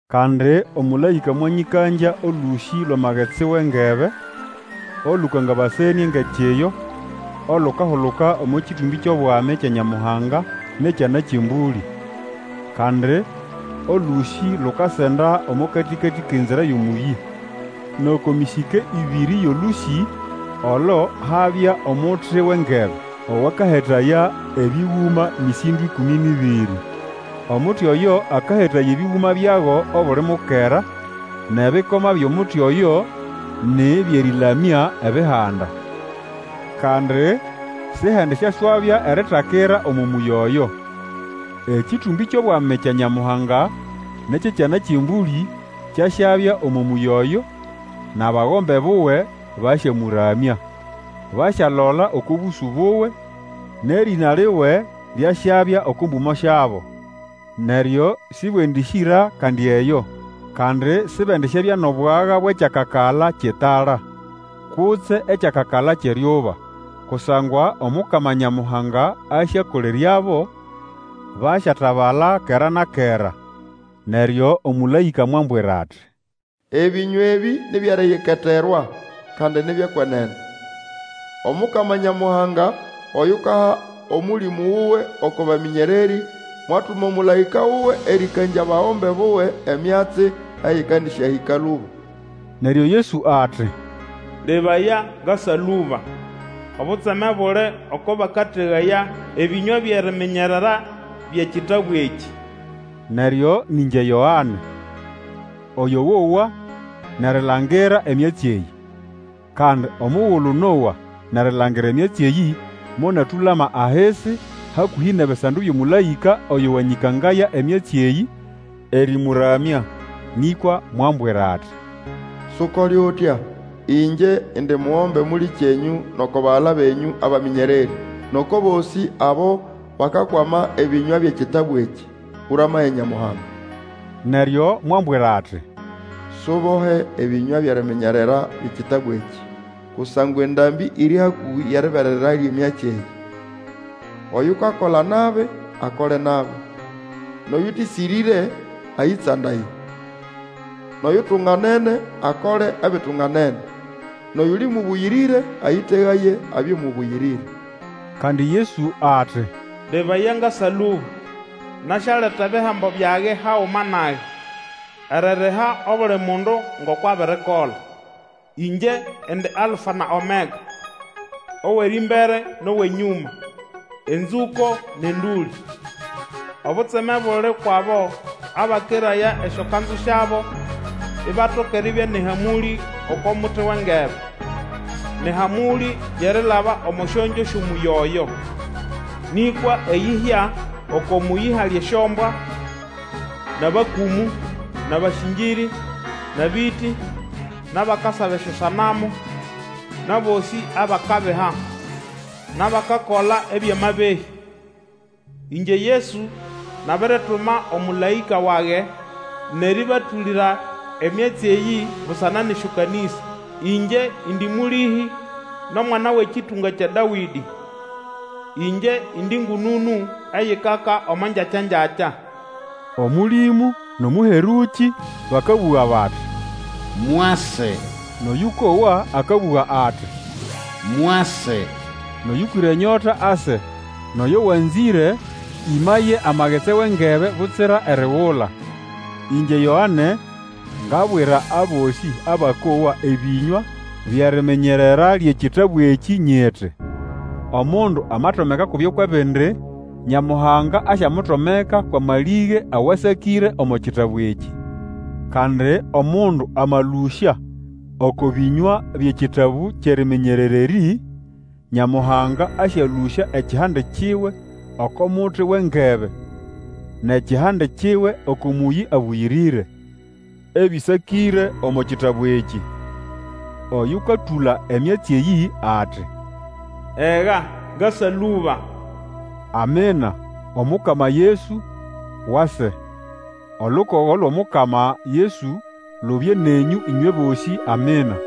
Kandi omũlaĩka mwanyĩkangya olũsĩ lwʼamagetsi wʼengebe, olũkangabasenĩe ngʼekiyo, olukahuluka omo kĩtũmbĩ kyʼobwami kya Nyamuhanga, nʼekyʼEkyana kyʼEmbũlĩ, kandi olũsĩ lukasenda omo katĩkatĩ kʼenzira yʼomũyĩ. Nʼoko mĩsĩke ĩbĩrĩ yʼolũsĩ olo habya omuti wʼengebe, Owakahetaya ebĩgũma mĩsĩndo ĩkũmĩ nʼĩbĩrĩ. Omuti oyo akahetaya ebĩgũma byago obuli mukera, nʼebikoma byʼomuti oyo nĩ byʼerĩlamya ebihanda. Kandi Sihendisyaswabya eritakira omo mũyĩ oyo. Ekĩtũmbĩ kyʼobwami kya Nyamuhanga nʼekyʼEkyana kyʼEmbũlĩ kyasyabya omo mũyĩ oyo, nʼabagombe buwe basyamũramya. Basyalola oko bũsũ buwe, nʼerĩna liwe lyasyabya oko mbũmo syabo. Neryo sĩbwendĩsyĩra kandi eyo, kandi sibendisyabya nʼobwaga bwʼekyakakala kyʼetala, kutse ekyakakala kyʼeryuba, kusangwa Omukama Nyamuhanga asyakoleryabo, basyatabala kera na kera. Neryo omũlaĩka mwambwira ati, Ebĩnywa ebĩ ni byʼeriyiketerwa, kandi ni byʼekwenene. Omukama Nyamuhanga, oyukaha Omũlĩmũ wuwe oko bamĩnyererĩ, mwatuma omũlaĩka wuwe erĩkangya abagombe buwe emyatsi eyĩkandĩsyahĩka lũba. Neryo Yesu ati, Lebaya! Ngasa lũba! Obutseme buli oko bakategaya ebĩnywa byʼeriminyerera byʼekitabu ekĩ! Neryo nĩ ngye Yoane, oyo wowa nʼerilangira emyatsi eyĩ. Kandi omugulu nowa nʼerilangira emyatsi eyĩ, monatũlama ahisi hakũhĩ nʼebisando byʼomũlaĩka oyo wanyĩkangaya emyatsi eyĩ, erĩmũramya. Nĩkwa mwambwira ati, Sukole utya! Ĩngye indi mugombe mũlĩkyenyũ nʼoko bagala benyũ abamĩnyererĩ, nʼoko bosĩ abo bakakwama ebĩnywa byʼekitabu ekĩ. Ũramaye Nyamuhanga! Neryo mwambwira ati, Subohe ebĩnywa byʼeriminyerera byʼekitabu ekĩ, kusangwa endambĩ iri hakũhĩ yʼeribererera lyʼemyatsi eyĩ. Oyukakola nabi, akole nabi; nʼoyũtĩsĩrĩre, ayĩtsandaye; nʼoyutunganene, akole ebitunganene, nʼoyuli mũbũyĩrĩre, ayĩtegaye abye mũbũyĩrĩre. Kandi Yesu ati, Lebaya! Ngasa lũba! Nasyaleta ebihembo byage haguma nage, eririha obuli mundu ngoko abirikola. Ĩngye indi Alfa na Omega, owʼerĩmbere, nʼowʼenyũma, enzũko nʼendũlĩ. Obutseme buli ukwʼabo abakeraya esyokanzu syabo ibatoka eribya nʼehamũlĩ oko muti wʼengebe, nʼehamũlĩ yʼerilaba omo syongyo syʼomũyĩ oyo. Nĩkwa eyĩhya oko mũyĩ hali esyombwa, nʼabakũmũ, nʼabasĩngĩrĩ, nʼabĩtĩ, nʼabakasaba esyosanamu, nʼabosĩ abakabiha, nʼabakakola ebyʼamabehĩ. Ĩngye Yesu nabirituma omũlaĩka wage nʼerĩbatũlĩra emyatsi eyĩ busana nʼesyokanĩsa. Ingye indi Mũlĩhĩ nʼomwana wʼekĩtũnga kya Dawĩdĩ. Ĩngye indi ngũnũnũ eyikaka omo ngyakya-ngyakya. Omũlĩmũ, nʼomũherũkĩ, bakabũga bati, Mwase! Nʼoyũkowa akabũga ati, Mwase! Nʼoyũkwĩre enyota ase, nʼoyo wanzĩre, ĩmaye amagetsi wʼengebe butsira erigula. Ĩngye Yoane, ngabwira abosĩ abakowa ebĩnywa byʼeriminyerera lyʼekitabu ekĩ nyiti, Omundu amatomeka kubyo kwʼebindi, Nyamuhanga asyamutomeka kwamalĩge awasakĩre omo kitabu ekĩ. Kandi omundu amalũsya oko bĩnywa byʼekitabu kyʼeriminyerera erĩ, Nyamuhanga asyalũsya ekihande kiwe oko muti wʼengebe, nʼekihande kiwe oko mũyĩ abũyĩrĩre, ebĩsakĩre omo kitabu ekĩ. Oyũkatũla emyatsi eyĩ ati, Ega! Ngasa lũba! Amina! Omukama Yesu, wase! Olukogo lwʼOmukama Yesu lubye nenyũ ĩnywe bosĩ. Amina.